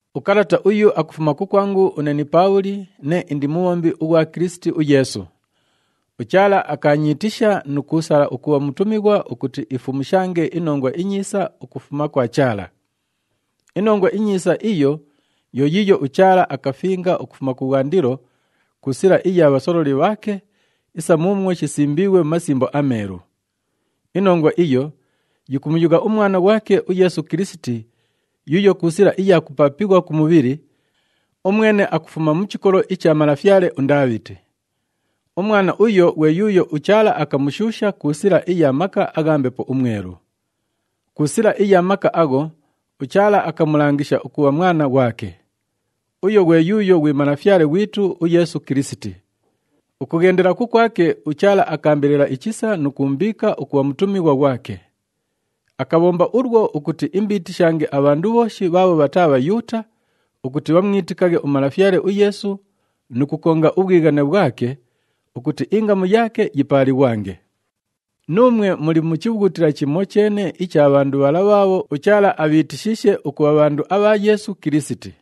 Ukalata uyu akufuma kukwangu une ni Paabhuli, nee indi mubhombi ughwa Kilisiti uYeesu. UChaala akaanyiitisha nu kuusala ukubha mutumighwa ukuti ifumushange iNongwa iNyiisa ukufuma kwa Chaala. INongwa iNyiisa iyo yo yiiyo uChaala akafinga ukufuma kubhwandilo ku sila iya bhasololi bhaake isa muumwo shisimbiighwe mu Masimbo aMeelu. Inongwa iyo yikumuyugha uMwana ghwake uYeesu Kilisiti yuuyo ku sila iya kupaapighwa ku mubhili, umwene akufuma mu chikolo icha malafyale uNdaabhiti. Umwana uyo ghwe yuuyo uChaala akamushuusha ku sila iya maka agha Mbepo uMwelu. Ku sila iya maka agho, uChaala akamulangisha ukubha Mwana ghwake. Uyo ghwe yuuyo ghwi Malafyale ghwitu uYeesu Kilisiti. Ukughendela kukwake, uChaala akaambelela ichisa nu kuumbiika ukubha mutumighwa ghwake. Akabhomba ulwo ukuti imbiitishange abhandu bhooshi bhaabho bhataa Bhayuuta, ukuti bhamwitikaghe uMalafyale uYeesu nu kukonga ubhwighane bhwake ukuti ingamu yaake yipaalighwange. Nuumwe muli mu chibhughutila chimocheene icha bhandu bhala bhaabho uChaala abhiitishiishe ukubha bhandu abha Yeesu Kilisiti.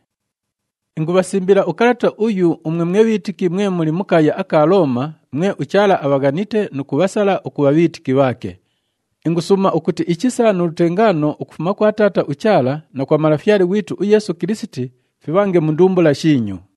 Ingubhasimbila ukalata uyu umwe mwe bhiitiki mwe muli mu kaaya aka Looma, mwe uChaala abhaghanite nu kubhasala ukubha bhiitiki bhaake. Ingusuuma ukuti ichisa nu lutengaano ukufuma kwa Taata uChaala na kwa Malafyale ghwitu uYeesu Kilisiti fibhange mu ndumbula shiinyu.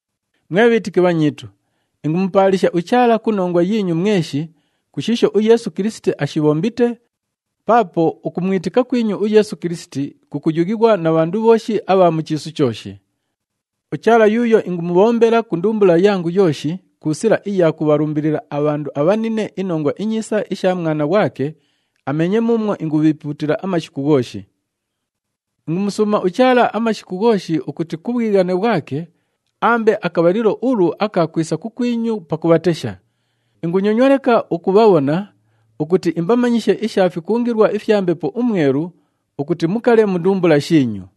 Mwe bhiitiki bhanyiitu, ingumupaalisha uChaala ku nongwa yiinyu mweshi ku shiisho uYeesu Kilisiti aashibhombite, paapo ukumwitika kwinyu uYeesu Kilisiti kukuyughighwa na bhandu bhooshi abha mu chiisu chooshi. UChaala yuuyo ingumubhombela ku ndumbula yangu yooshi ku sila iya kubhalumbilila abhandu abhanine iNongwa iNyiisa isha Mwana ghwake, ameenye muumwo ingubhiipuutila amashiku ghooshi. Ingumusuuma uChaala amashiku ghooshi ukuti ku bhwighane bhwake aambe akabhalilo ulu aka kwisa kukwinyu pakubhatesha. Ingunyonywa leka ukubhabhona ukuti imbamanyishe isha fikungilwa ifya Mbepo uMwelu ukuti mukale mu ndumbula shiinyu.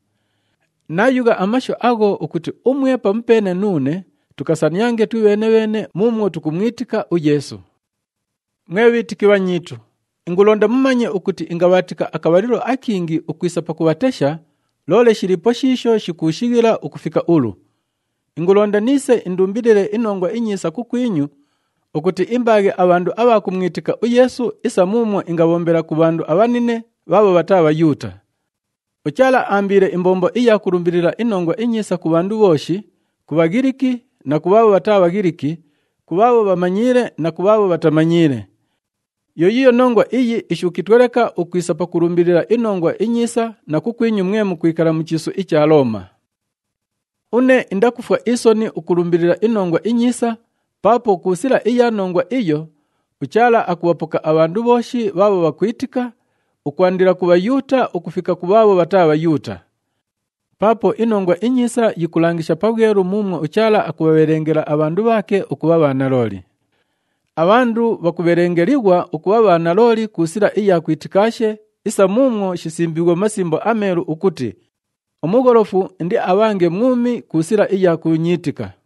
Naayugha amashu agho ukuti umwe pamupeene nuune tukasaniange twibheene-bheene muumwo tukumwitika uYeesu. Mwe bhiitiki bhanyiitu, ingulonda mumanye ukuti ingabhaatika akabhalilo akingi ukwisa pakubhatesha, loole shiliipo shiisho shikuushighila ukufika ulu. Ingulonda niise indumbilile iNongwa iNyiisa kukwinyu ukuti imbaaghe abhandu abha kumwitika uYeesu isa muumwo ingabhombela ku bhandu abhanine bhaabho bhataa Bhayuuta. UChaala aambiile imbombo iya kulumbilila iNongwa iNyiisa ku bhandu bhooshi, ku Bhaghiliki na ku bhaabho bhataa Bhaghiliki, ku bhaabho bhamanyiile na ku bhaabho bhatamanyiile. Yo yiiyo nongwa iyi ishuukitwe leka ukwisa pakulumbilila iNongwa iNyiisa na kukwinyu mwe mukwikala mu chiisu icha Looma. Une indakufwa isoni ukulumbilila iNongwa iNyiisa paapo ku sila iya nongwa iyo, uChaala akubhapoka abhandu bhooshi bhaabho bhakwitika, ukwandila ku Bhayuuta ukufika ku bhaabho bhataa Bhayuuta. Paapo iNongwa iNyiisa yikulangisha pabhwelu muumwo uChaala akubhabhelengela abhandu bhaake ukubha bhanalooli pandaashi papaake. Abhandu bhakubhelengelighwa ukubha bhanalooli ku sila iya kwitikaashe isa muumwo shisimbiighwe mu Masimbo aMeelu ukuti, “Umugholofu indiabhange mwumi ku sila iya kuunyiitika.”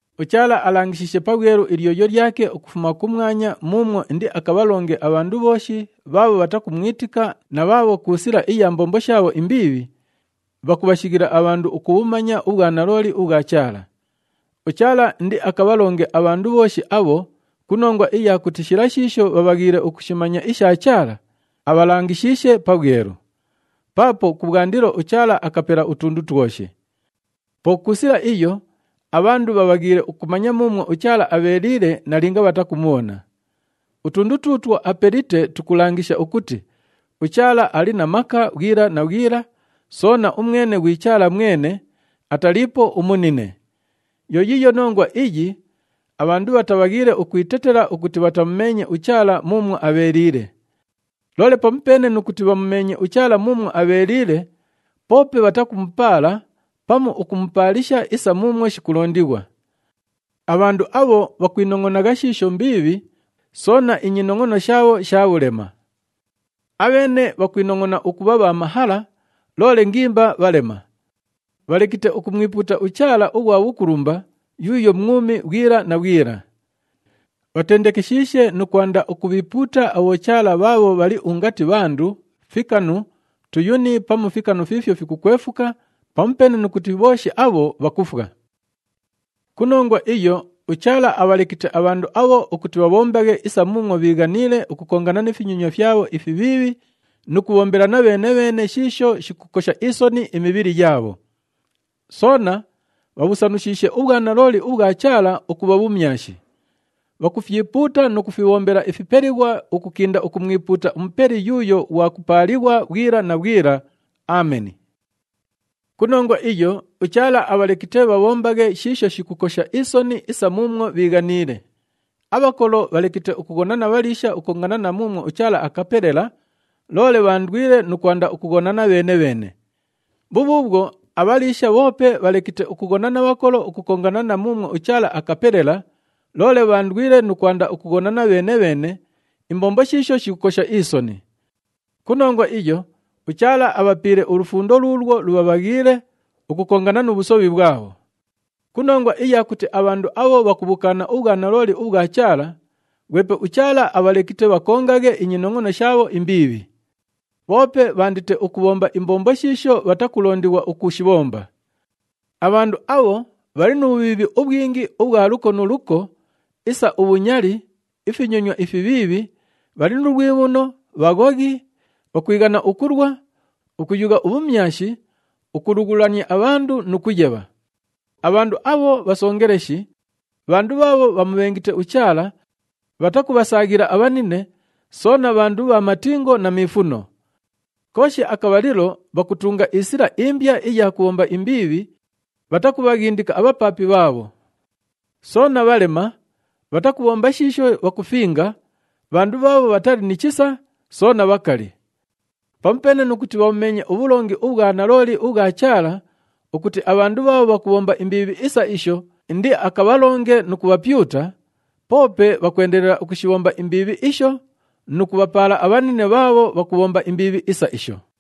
UChaala alangishiishe pabhwelu ilyoyo lyake ukufuma kumwanya muumwo indiakabhalonge abhandu bhooshi bhaabho bhatakumwitika na bhaabho ku sila iya mbombo shaabho imbiibhi, bhakubhashighila abhandu ukubhumanya ubhwanalooli ubhwa Chaala. UChaala indiakabhalonge abhandu bhooshi abho ku nongwa iya kuti shila shiisho bhaabhaghiile ukushimanya isha Chaala, abhalangishiishe pabhwelu. Paapo kubhwandilo, uChaala akapela utundu twoshi. Po ku sila iyo, abhandu bhabhaghiile ukumanya muumwo uChaala abheeliile nalinga bhatakumubhona. Utundu tuutwo apelite tukulangisha ukuti uChaala ali na maka bhwila na bhwila, soona umwene ghwi Chaala mwene, ataliipo umunine. Yo yiiyo nongwa iyi abhandu bhatabhaghiile ukwitetela ukuti bhatamumeenye uChaala muumwo abheeliile. Loole pamupeene nu kuti bhamumeenye uChaala muumwo abheeliile, poope bhatakumupaala pamu ukumupaalisha isa muumwo shikulondighwa. Abhandu abho bhakwinongʼonagha shiisho mbiibhi, soona inyinongʼono shaabho sha bhulema. Abheene bhakwinongʼona ukubha bha mahala, loole ngimba bhalema. Bhalekite ukumwipuuta uChaala ughwa bhukulumba yuuyo mwumi bhwila na bhwila. Bhatendekeshiishe nu kwanda ukubhiipuuta abhochaala bhaabho bhali ungati bhandu, fikanu, tuyuni pamu fikanu fiifyo fikukwefuka, pamupeene nu kuti bhooshi abho bhakufwa. Ku nongwa iyo, uChaala abhalekite abhandu abho ukuti bhabhombaghe isa muumwo bhiighaniile ukukongana ni finyonywa fyabho ifibhiibhi nu kubhombelana bheene-bheene shiisho shikukosha isoni imibhili yaabho. Soona bhabhusanushiishe ubhwanalooli ubhwa Chaala ukubha bhumyashi. Bhakufyipuuta nu kufibhombela ifipelighwa ukukinda ukumwipuuta uMupeli yuuyo ghwa kupaalighwa bhwila na bhwila. Ameni. Ku nongwa iyo, uChaala abhalekite bhabhombaghe shiisho shikukosha isoni isa muumwo bhiighaniile. Abhakolo bhalekite ukughona na bhaliisha ukukongana na muumwo uChaala akapelela, loole bhaandwile nu kwanda ukughonana bheene-bheene. Bhubhuubhwo, abhaliisha bhoope bhalekite ukughona na bhakolo ukukongana na muumwo uChaala akapelela, loole bhaandwile nu kwanda ukughonana bheene-bheene, imbombo shiisho shikukosha isoni. Ku nongwa iyo, uChaala abhapiile ulufundo luulwo lubhabhaghiile ukukongana nu bhusobhi bhwabho. Ku nongwa iya kuti abhandu abho bhakubhukaana ubhwanalooli ubhwa Chaala, ghwepe uChaala abhalekite bhakongaghe inyinongʼono shaabho imbiibhi. Bhoope bhaandite ukubhomba imbombo shiisho bhatakulondighwa ukushibhomba. Abhandu abho bhali nu bhubhiibhi ubhwingi ubhwa luko nu luko isa ubhunyali, ifinyonywa ifibhiibhi, bhali nu lwibhuno, bhaghoghi, bhakwighana ukulwa, ukuyugha ubhumyashi, ukulughulania abhandu nu kuyebha. Abhandu abho bhasongeleshi, bhandu bhaabho bhamubhengite uChaala, bhatakubhasaaghila abhanine, soona bhandu bha matingo na miifuno. Kooshi akabhalilo bhakutunga isila imbya iya kubhomba imbiibhi, bhatakubhaghindika abhapaapi bhaabho. Soona bhalema, bhatakubhomba shiisho bhakufinga, bhandu bhaabho bhatali ni chisa soona bhakali. Pamupeene nu kuti bhabhumeenye ubhulongi ubhwa nalooli ubhwa Chaala ukuti abhandu bhaabho bhakubhomba imbiibhi isa isho indiakabhalonge nu kubhapyuta, poope bhakwendelela ukushibhomba imbiibhi isho nu kubhapaala abhanine bhaabho bhakubhomba imbiibhi isa isho.